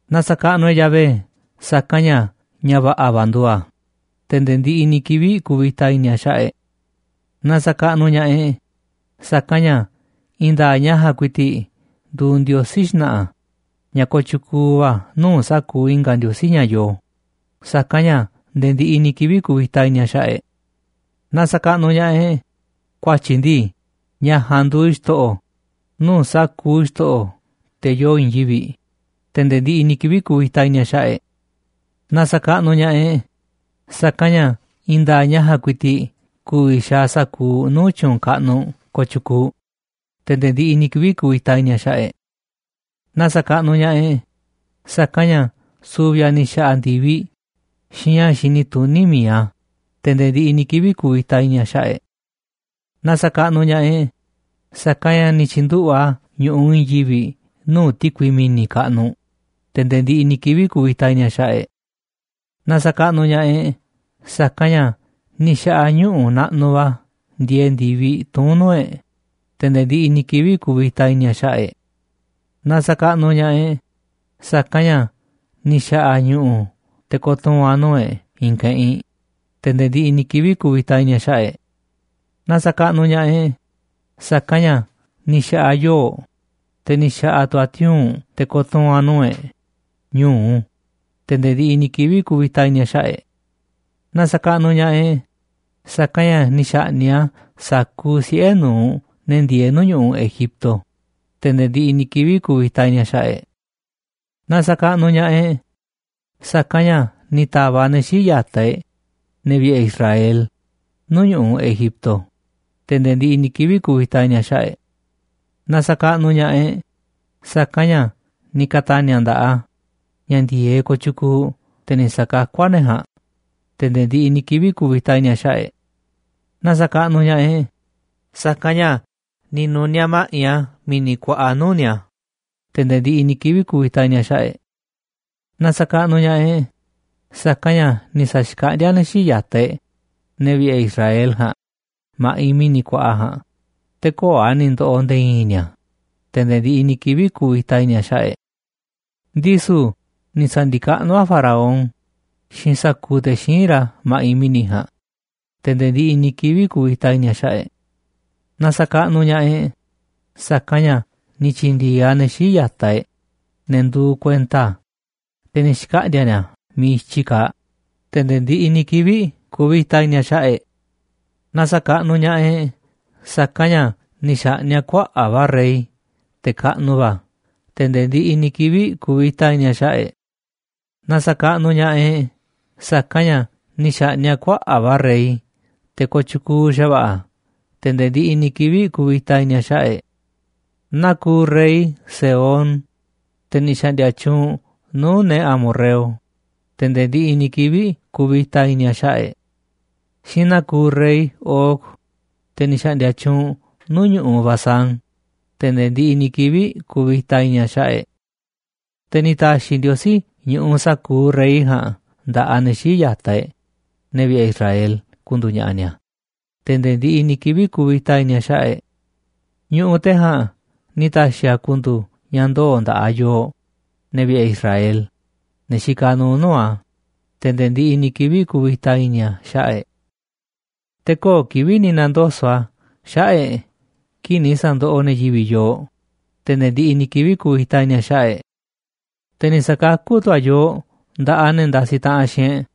Na sa̱kaꞌnuꞌ e̱ꞌ Yahvé, sa̱kanꞌ ña̱ ña̱ va̱ꞌa̱ va̱ nduuꞌ a̱, te̱ nde̱e̱ ndiꞌiꞌ ni̱ kivi̱ꞌ kuvita i̱ni̱ a̱ xaꞌa̱ꞌ e̱ꞌ. Na sa̱kaꞌnuꞌ ña̱ꞌaꞌ e̱ꞌ, sa̱kanꞌ ña̱ i̱i̱n nda̱a̱ꞌ ña̱ ja̱a̱nꞌ ku̱i̱ti̱ꞌ nduuꞌ Ndiosí xna̱ꞌa̱ ña̱ kooꞌ tyukuuꞌ va̱ nuu̱ꞌ sa̱kuuꞌ i̱nga̱ ndiosí ña̱ yoo, sa̱kanꞌ ña̱ nde̱e̱ ndiꞌiꞌ ni̱ kivi̱ꞌ kuvita i̱ni̱ a̱ xaꞌa̱ꞌ e̱ꞌ. Na sa̱kaꞌnuꞌ ña̱ꞌaꞌ e̱ꞌ, ku̱a̱tyi̱ ndii ña̱ ja̱a̱nꞌ nduuꞌ Xto̱ꞌo̱ nuu̱ꞌ sa̱kuuꞌ xto̱ꞌo̱, te̱ yoo i̱i̱n yivi̱ꞌ, te̱ nde̱e̱ ndiꞌiꞌ ni̱ kivi̱ꞌ kuvita i̱ni̱ a̱ xaꞌa̱ꞌ e̱ꞌ. Na sa̱kaꞌnuꞌ ña̱ꞌaꞌ e̱ꞌ, sa̱kanꞌ ña̱ i̱i̱n nda̱a̱ꞌ ña̱ ja̱a̱nꞌ ku̱i̱ti̱ꞌ ku̱vi̱ xaaꞌ sa̱kuuꞌ nuu̱ꞌ tyu̱u̱n kaꞌnuꞌ kooꞌ tyukuuꞌ, te̱ nde̱e̱ ndiꞌiꞌ ni̱ kivi̱ꞌ kuvita i̱ni̱ a̱ xaꞌa̱ꞌ e̱ꞌ. Na sa̱kaꞌnuꞌ ña̱ꞌaꞌ e̱ꞌ, sa̱kanꞌ ña̱ su̱vi̱ a̱ ni̱ xa̱ꞌa̱ ndi̱viꞌ xiinꞌ ña̱ xini tuní mi̱iꞌ a̱, te̱ nde̱e̱ ndiꞌiꞌ ni̱ kivi̱ꞌ kuvita i̱ni̱ a̱ xaꞌa̱ꞌ e̱ꞌ. Na sa̱kaꞌnuꞌ ña̱ꞌaꞌ e̱ꞌ, sa̱kanꞌ ña̱ ni̱ tyi̱nduꞌu̱ꞌ a̱ ñu̱ꞌuꞌ i̱i̱n yivi̱ꞌ nuu̱ꞌ ti̱kui mi̱ni̱ kaꞌnuꞌ, te̱ nde̱e̱ ndiꞌiꞌ ni̱ kivi̱ꞌ kuvita i̱ni̱ a̱ xaꞌa̱ꞌ e̱ꞌ. Na sa̱kaꞌnuꞌ ña̱ꞌaꞌ e̱ꞌ, sa̱kanꞌ ña̱ ni̱ xa̱ꞌa̱ a̱ ñuꞌu̱ naꞌnuꞌ va̱ ndieeꞌ ndi̱viꞌ tuún nuu̱ꞌ e̱ꞌ, te̱ nde̱e̱ ndiꞌiꞌ ni̱ kivi̱ꞌ kuvita i̱ni̱ a̱ xaꞌa̱ꞌ e̱ꞌ. Na sa̱kaꞌnuꞌ ña̱ꞌaꞌ e̱ꞌ, sa̱kanꞌ ña̱ ni̱ xa̱ꞌa̱ a̱ ñu̱ꞌu̱ te̱ ko̱tuu̱n a̱ nuu̱ꞌ e̱ꞌ i̱i̱n keꞌinꞌ, te̱ nde̱e̱ ndiꞌiꞌ ni̱ kivi̱ꞌ kuvita i̱ni̱ a̱ xaꞌa̱ꞌ e̱ꞌ. Na sa̱kaꞌnuꞌ ña̱ꞌaꞌ e̱ꞌ, sa̱kanꞌ ña̱ ni̱ xa̱ꞌa̱ a̱ yoo̱ꞌ, te̱ ni̱ xa̱ꞌa̱ tu̱ a̱ tiuu̱nꞌ te̱ ko̱tuu̱n a̱ nuu̱ꞌ e̱ꞌ ñu̱u, te̱ nde̱e̱ ndiꞌiꞌ ni̱ kivi̱ꞌ kuvita i̱ni̱ a̱ xaꞌa̱ꞌ e̱ꞌ. Na sa̱kaꞌnuꞌ ña̱ꞌaꞌ e̱ꞌ, sa̱kanꞌ ña̱ ni̱ xa̱ꞌni̱ꞌ a̱ sa̱kuuꞌ siꞌe̱ nu̱uꞌ ne̱ ndieeꞌ nuu̱ꞌ ñu̱ꞌuꞌ Egipto, te̱ nde̱e̱ ndiꞌiꞌ ni̱ kivi̱ꞌ kuvita i̱ni̱ a̱ xaꞌa̱ꞌ e̱ꞌ. Na sa̱kaꞌnuꞌ ña̱ꞌaꞌ e̱ꞌ, sa̱kanꞌ ña̱ ni̱ ta̱va̱ꞌ a̱ ne̱ xii̱ꞌ ya̱taꞌ e̱ꞌ, ne̱ vi̱ꞌe̱ Israel, nuu̱ꞌ ñu̱ꞌuꞌ Egipto, te̱ nde̱e̱ ndiꞌiꞌ ni̱ kivi̱ꞌ kuvita i̱ni̱ a̱ xaꞌa̱ꞌ e̱ꞌ. Na sa̱kaꞌnuꞌ ña̱ꞌaꞌ e̱ꞌ, sa̱kanꞌ ña̱ ni̱ ka̱ta̱ni̱ a̱ nda̱ꞌaꞌ a̱ ña̱ ndi̱e̱eꞌ kooꞌ tyukuuꞌ te̱ ni̱ sa̱kakú a̱ ne̱ ja̱a̱nꞌ, te̱ nde̱e̱ ndiꞌiꞌ ni̱ kivi̱ꞌ kuvita i̱ni̱ a̱ xaꞌa̱ꞌ e̱ꞌ. Na sa̱kaꞌnuꞌ ña̱ꞌaꞌ e̱ꞌ, sa̱kanꞌ ña̱ ni̱ nu̱niaꞌ ma̱ꞌiꞌ a̱ mi̱ni̱ kuaꞌa nuu̱ꞌ ni̱a̱, te̱ nde̱e̱ ndiꞌiꞌ ni̱ kivi̱ꞌ kuvita i̱ni̱ a̱ xaꞌa̱ꞌ e̱ꞌ. Na sa̱kaꞌnuꞌ ña̱ꞌaꞌ e̱ꞌ, sa̱kanꞌ ña̱ ni̱ sa̱xkaꞌndíá a̱ ne̱ xii̱ꞌ ya̱taꞌ e̱ꞌ, ne̱ vi̱ꞌe̱ Israel ja̱a̱nꞌ, ma̱ꞌiꞌ mi̱ni̱ kuaꞌa ja̱a̱nꞌ, te̱ köo̱ꞌ a̱ ni̱ ndo̱ꞌo̱ nde̱e̱ i̱i̱n ni̱a̱, te̱ nde̱e̱ ndiꞌiꞌ ni̱ kivi̱ꞌ kuvita i̱ni̱ a̱ xaꞌa̱ꞌ e̱ꞌ. Ndisu̱ ni̱ sa̱ndi̱kaꞌnú a̱ Faraón xiinꞌ sa̱kuuꞌ te̱ xíinꞌ ra̱ ma̱ꞌiꞌ mi̱ni̱ ja̱a̱nꞌ, te̱ nde̱e̱ ndiꞌiꞌ ni̱ kivi̱ꞌ kuvita i̱ni̱ a̱ xaꞌa̱ꞌ e̱ꞌ. Na sa̱kaꞌnuꞌ ña̱ꞌaꞌ e̱ꞌ, sa̱kanꞌ ña̱ ni̱ tyi̱ndi̱e̱eꞌ a̱ ne̱ xii̱ꞌ ya̱taꞌ e̱ꞌ, ne̱ nduuꞌ kuenta a̱, te̱ ni̱ xkaꞌndi̱a̱ ni̱a̱ miiꞌ i̱tyi kaaꞌ, te̱ nde̱e̱ ndiꞌiꞌ ni̱ kivi̱ꞌ kuvita i̱ni̱ a̱ xaꞌa̱ꞌ e̱ꞌ. Na sa̱kaꞌnuꞌ ña̱ꞌaꞌ e̱ꞌ, sa̱kanꞌ ña̱ ni̱ xa̱ꞌni̱ꞌ a̱ kuaꞌa̱ꞌ va̱ rey, te̱ kaꞌnuꞌ va̱, te̱ nde̱e̱ ndiꞌiꞌ ni̱ kivi̱ꞌ kuvita i̱ni̱ a̱ xaꞌa̱ꞌ e̱ꞌ. Na sa̱kaꞌnuꞌ ña̱ꞌaꞌ e̱ꞌ, sa̱kanꞌ ña̱ ni̱ xa̱ꞌni̱ꞌ a̱ kuaꞌa̱ꞌ va̱ rey, te̱ kooꞌ tyukuuꞌ xa̱va̱ꞌa̱, te̱ nde̱e̱ ndiꞌiꞌ ni̱ kivi̱ꞌ kuvita i̱ni̱ a̱ xaꞌa̱ꞌ e̱ꞌ. Naa kuuꞌ rey Sehón, te̱ ni̱ xa̱ꞌndi̱a̱ tyuunꞌ nuu̱ꞌ ne̱ amorreo, te̱ nde̱e̱ ndiꞌiꞌ ni̱ kivi̱ꞌ kuvita i̱ni̱ a̱ xaꞌa̱ꞌ e̱ꞌ. Xiinꞌ naa kuuꞌ rey Og, te̱ ni̱ xaꞌndia tyuunꞌ nuu̱ꞌ ñu̱ꞌuꞌ Basán, te̱ nde̱e̱ ndiꞌiꞌ ni̱ kivi̱ꞌ kuvita i̱ni̱ a̱ xaꞌa̱ꞌ e̱ꞌ. Te̱ ni̱ ta̱xi̱ Ndiosí ñu̱ꞌuꞌ sa̱kuuꞌ rey ja̱a̱nꞌ nda̱ꞌaꞌ ne̱ xii̱ꞌ ya̱taꞌ e̱ꞌ, ne̱ vi̱ꞌe̱ Israel, ku̱ndu̱u̱ ña̱ꞌa̱ ni̱a̱, te̱ nde̱e̱ ndiꞌiꞌ ni̱ kivi̱ꞌ kuvita i̱ni̱ a̱ xaꞌa̱ꞌ e̱ꞌ. Ñu̱ꞌuꞌ te̱ ja̱a̱nꞌ ni̱ ta̱xi̱ a̱ ku̱ndu̱u̱ ña̱ ndoo̱ nda̱ꞌaꞌ yooꞌ, ne̱ vi̱ꞌe̱ Israel, ne̱ xikaꞌ nuuꞌ nuu̱ꞌ a̱, te̱ nde̱e̱ ndiꞌiꞌ ni̱ kivi̱ꞌ kuvita i̱ni̱ a̱ xaꞌa̱ꞌ e̱ꞌ. Te̱ köo̱ꞌ kivi̱ꞌ ni̱ na̱ndoso̱ꞌ a̱ xaꞌa̱ꞌ e̱ꞌ kii̱ꞌ ni̱ sa̱ndoꞌoꞌ ne̱ yivi̱ꞌ yooꞌ, te̱ nde̱e̱ ndiꞌiꞌ ni̱ kivi̱ꞌ kuvita i̱ni̱ a̱ xaꞌa̱ꞌ e̱ꞌ. Te̱ ni̱ sa̱kakú tu̱ a̱ yooꞌ nda̱ꞌaꞌ ne̱ ndasiꞌ taꞌanꞌ xiinꞌ e̱ꞌ,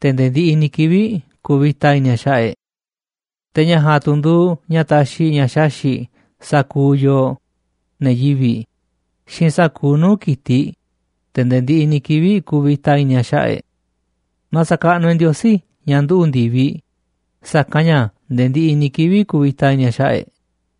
te̱ nde̱e̱ ndiꞌiꞌ ni̱ kivi̱ꞌ kuvita i̱ni̱ a̱ xaꞌa̱ꞌ e̱ꞌ. Te̱ ña̱ ja̱a̱nꞌ tu̱ nduuꞌ ña̱ taxiꞌ ña̱ xaxi̱ꞌ sa̱kuuꞌ yooꞌ, ne̱ yivi̱ꞌ, xiinꞌ sa̱kuuꞌ nuu̱ꞌ ki̱tiꞌ, te̱ nde̱e̱ ndiꞌiꞌ ni̱ kivi̱ꞌ kuvita i̱ni̱ a̱ xaꞌa̱ꞌ e̱ꞌ. Na sa̱kaꞌnuꞌ e̱ꞌ Ndiosí ña̱ nduꞌu̱ꞌ ndi̱viꞌ, sa̱kanꞌ ña̱ nde̱e̱ ndiꞌiꞌ ni̱ kivi̱ꞌ kuvita i̱ni̱ a̱ xaꞌa̱ꞌ e̱ꞌ.